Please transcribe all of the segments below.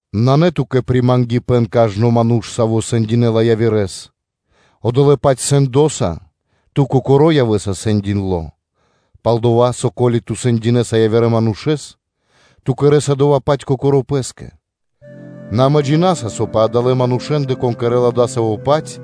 Нанэ ту́кэ примангипэн, кажно ману́ш, саво́ сэндинэла явирэ́с, одолэ́-паць сэндоса ту кокоро́ явэ́са сэндиндло, пал-дова́ со, ко́ли ту сэндинэса явирэ манушэ́с, ту кэрэ́са дова́-паць кокоро́ пэ́скэ. Нэ амэ джина́са, со пэ адалэ́ манушэ́ндэ, кон кэрэ́ла дасаво-паць,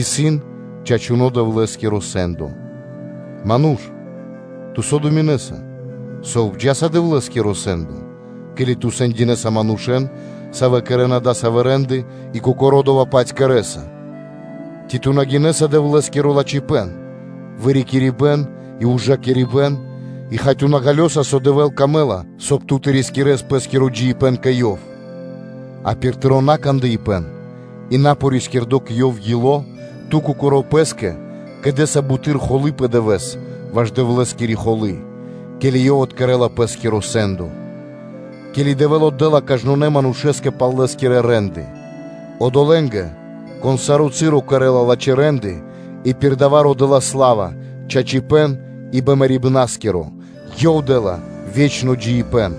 исын чачуно́ Дэвлэ́скиро сэ́ндо. Ману́ш, ту со думинэса, со обджала Дэвлэ́скиро сэ́ндо, ке́ли ту сэндинэса манушэ́н, савэ́ кэрэ́на дасавэ́ рэ́нды и кокоро́ дова́-паць кэрэ́са? Ци ту на гинэса Дэвлэ́скиро лачхипэ́н, вырикирибэн и ужакирибэ́н, и, хай, ту на ґалёса, со Дэвлэ́скэ трэй, соб (кай) ту тэ рискирэс пэ́скиро джиибэ́н кэ Ёв? А пир тыро́ накандыпэн и напорискирдо кэ Ёв ило́, ту кокоро́ пэ́скэ кэдэса буты́р холы́ пэ дывэ́с ваш Дэвлэ́скири холы́, ке́ли Ёв откэрэла Пэ́скиро сэ́ндо, ке́ли Дэвэ́л отдэ́ла кажнонэ́ манушэ́скэ пхэнэ́ла пал лэ́скирэ рэ́нды: одолэ́нгэ, кон саро́ часо кэрэ́ла лачхэ́ рэ́нды и пир дава́ родэ́ла сла́ва, чачипэ́н и бимэрибнаскиро ко́нцо (яго́ро), Ёв дэ́ла ве́чно джиибэ́н.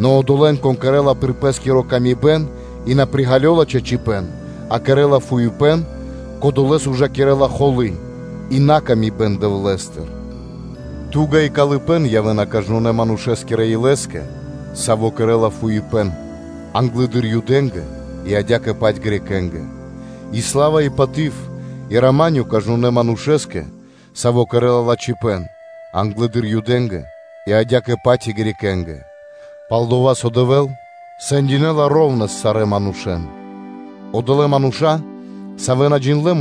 Нэ одолэ́н, кон кэрэ́ла пир пэ́скири годы́ и на приґалёла чачипэ́н, а кэрэ́ла фуипэ́н, кодолэ́с ужакирэ́ла холы́ и холямипэн Дэвлэ́стыр, ту́га и калыпэ́н явэ́на кажнонэ́ (сваконэ) манушэ́скирэ илэскэ, саво́ кэрэ́ла фуипэ́н, англэды́р Юдэ́нгэ, и адя́кэ-паць и Элинэ́нгэ (Грекэ́нгэ/Баламэ́нгэ): а сла́ва и паты́в, и рама́нё кажнонэ́ манушэ́скэ, саво́ кэрэ́ла лачхипэ́н, англэды́р Юдэ́нгэ, и адя́кэ-паць и Элинэнгэ (Грекэ́нгэ): Пал-дова́ со Дэвэ́л кутякирэла шэра́ (ра́внэс) сарэ́ манушэ́н. Одолэ́ мануша́, савэ́ на джиндлэ́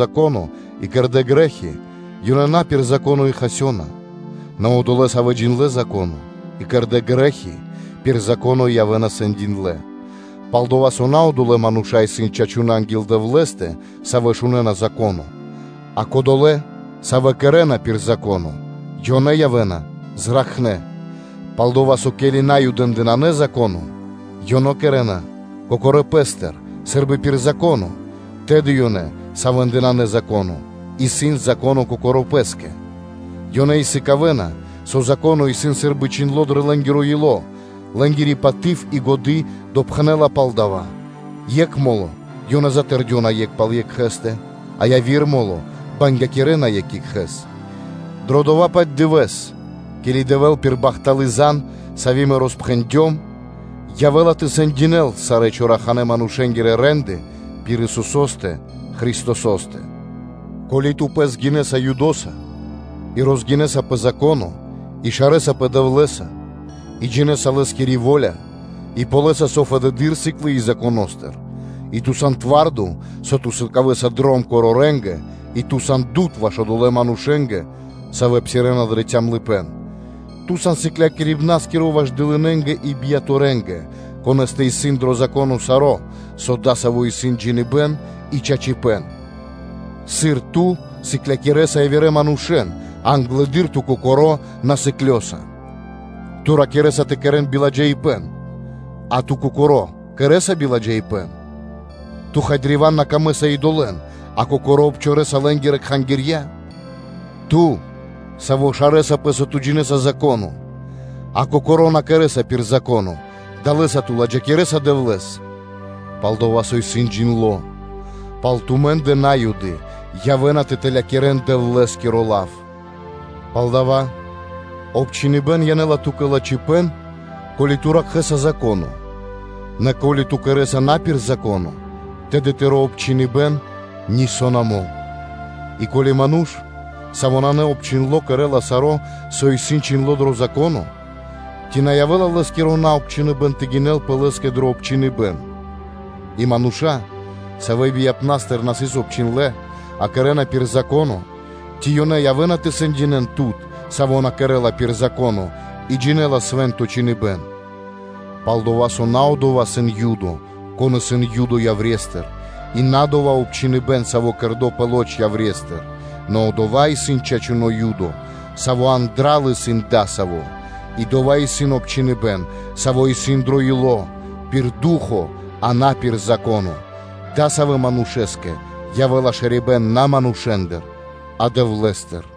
Зако́но и кэрдэ́ грэ́хи, ёнэ на пир Зако́но и хасёна; нэ одолэ́, савэ́ джиндлэ́ Зако́но и кэрдэ́ грэ́хи, ёнэ пир Зако́но и явэ́на сэндиндлэ; пал-дова́ со, на одолэ́ мануша́ исын чачунэ́ анги́л Дэвлэ́стэ, савэ́ шунэ́на Зако́но, а кодолэ́, савэ́ кэрэ́на пир Зако́но, ёнэ явэ́на зракхнэ́. Пал-дова́ со, ке́ли Наюдэ́ндэ нанэ Зако́но, ёнэ кэрэ́на кокорэ́ пэ́стыр, сы́рбы пир Зако́но, тэды ёнэ, савэ́ндэ нанэ Зако́но, исын Зако́но кокорэ́ пэ́скэ; ёнэ и сыкавэ́на, со Зако́но исын сы́рбы чхиндло́ дрэ лэ́нгиро ило́, лэ́нгири паты́в и годы́ допхэнэ́ла пал дава́, екх мо́ло ёнэ затэрдёна екх пал екхэ́стэ, а яви́р мо́ло бангякирэна екх екхэ́с; дро дова́-паць дывэ́с, ке́ли Дэвэ́л пир бахталы́ зан (звесь), сави́ мэ роспхэндём, явэ́ла тэ сэндякирэ́л сарэ́ чораханэ манушэ́нгирэ рэ́нды пир Исусо́стэ Христосо́стэ. Ко́ли ту пэс гинэса Юдоса и розгинэса пэ Зако́но, и шарэсапэ Дэвлэ́са, и джинэ́са Лэ́скири во́ля, и ґалёса, со исын фэдэды́р, сыклыи Законо́стыр; и ту сан твардо, со ту сан лыджаибнаскиро корорэнгэ и ту сан дуд ваш одолэ́ манушэ́нгэ, савэ́ псирэ́на дро калыпэ́н (цямлыпэ́н); ту сан сыкляри (наставнико) ваш дылынэнгэ и сыклякирибна́скиро бияторэнгэ, конэ́стэ исын дро Зако́но саро́, со дасаво исын джиныбэ́н и чачипэ́н: Сыр ту сыклякирэса явирэ манушэ́н, а англэды́р ту кокоро́ на сыклёса? Ту ракирэ́са тэ на кэрэ́н биладжаипэ́н, а ту кокоро́ кэрэ́са биладжаипэ́н? Ту́кэ, хай, древа́н на пир ило́ и́долы, а кокоро́ ту обчорэса лэ́нгирэ кхангирья? Ту, саво́ шарэсапэ, со ту джинэ́са Зако́но, а кокоро́ кэрэ́са на пир Зако́но, – далэ́са ту ладжакирэса Дэвлэ́с? Палдава́ исын чхиндло́: “Пал тумэ́ндэ На́юды явэ́на тэ тэлякирэн Дэвлэ́скиро лав.” Палдава́ обчхиныбэн янэ́ла ту́кэ лачхипэ́н, ко́ли ту ракхэса Зако́но: нэ ко́ли ту кэрэ́са на пир Зако́но, тэды тыро́ обчхиныбэн нисо́ на мол. И ко́ли ману́ш, саво́ исын наобчхиндло, кэрэ́ла саро́, со исын чхиндло́ дро Зако́но, ци на явэ́ла лэ́скиро наобчхиныбэн тэ гинэлпэ лэ́скэ дро обчхиныбэн? И мануша́, савэ́ бияныпнастыр на сыс обчхиндлэ́, а кэрэ́на пир Зако́но, ци ёнэ явэ́на тэ сэндинэ́н тут, саво́ на кэрэ́ла пир Зако́но и джинэ́ла Свэ́нто Чхиныбэ́н? Пал-дова́ со, на одова́ исын Юдо, кон исын Юдо яврестыр, и на дова́ обчхиныбэн, саво́ исын кэрдо́ пэ маса́ яврестыр; нэ одова́ исын чачуно́ Юдо, саво́ андра́л исын дасаво, и дова́ исын обчхиныбэн, саво́ исын дро ило́, пир ду́хо (фа́но), а на пир Зако́но, дасавэскэ манушэ́скэ явэ́ла шарибэ́н на манушэ́ндыр, а Дэвлэ́стыр.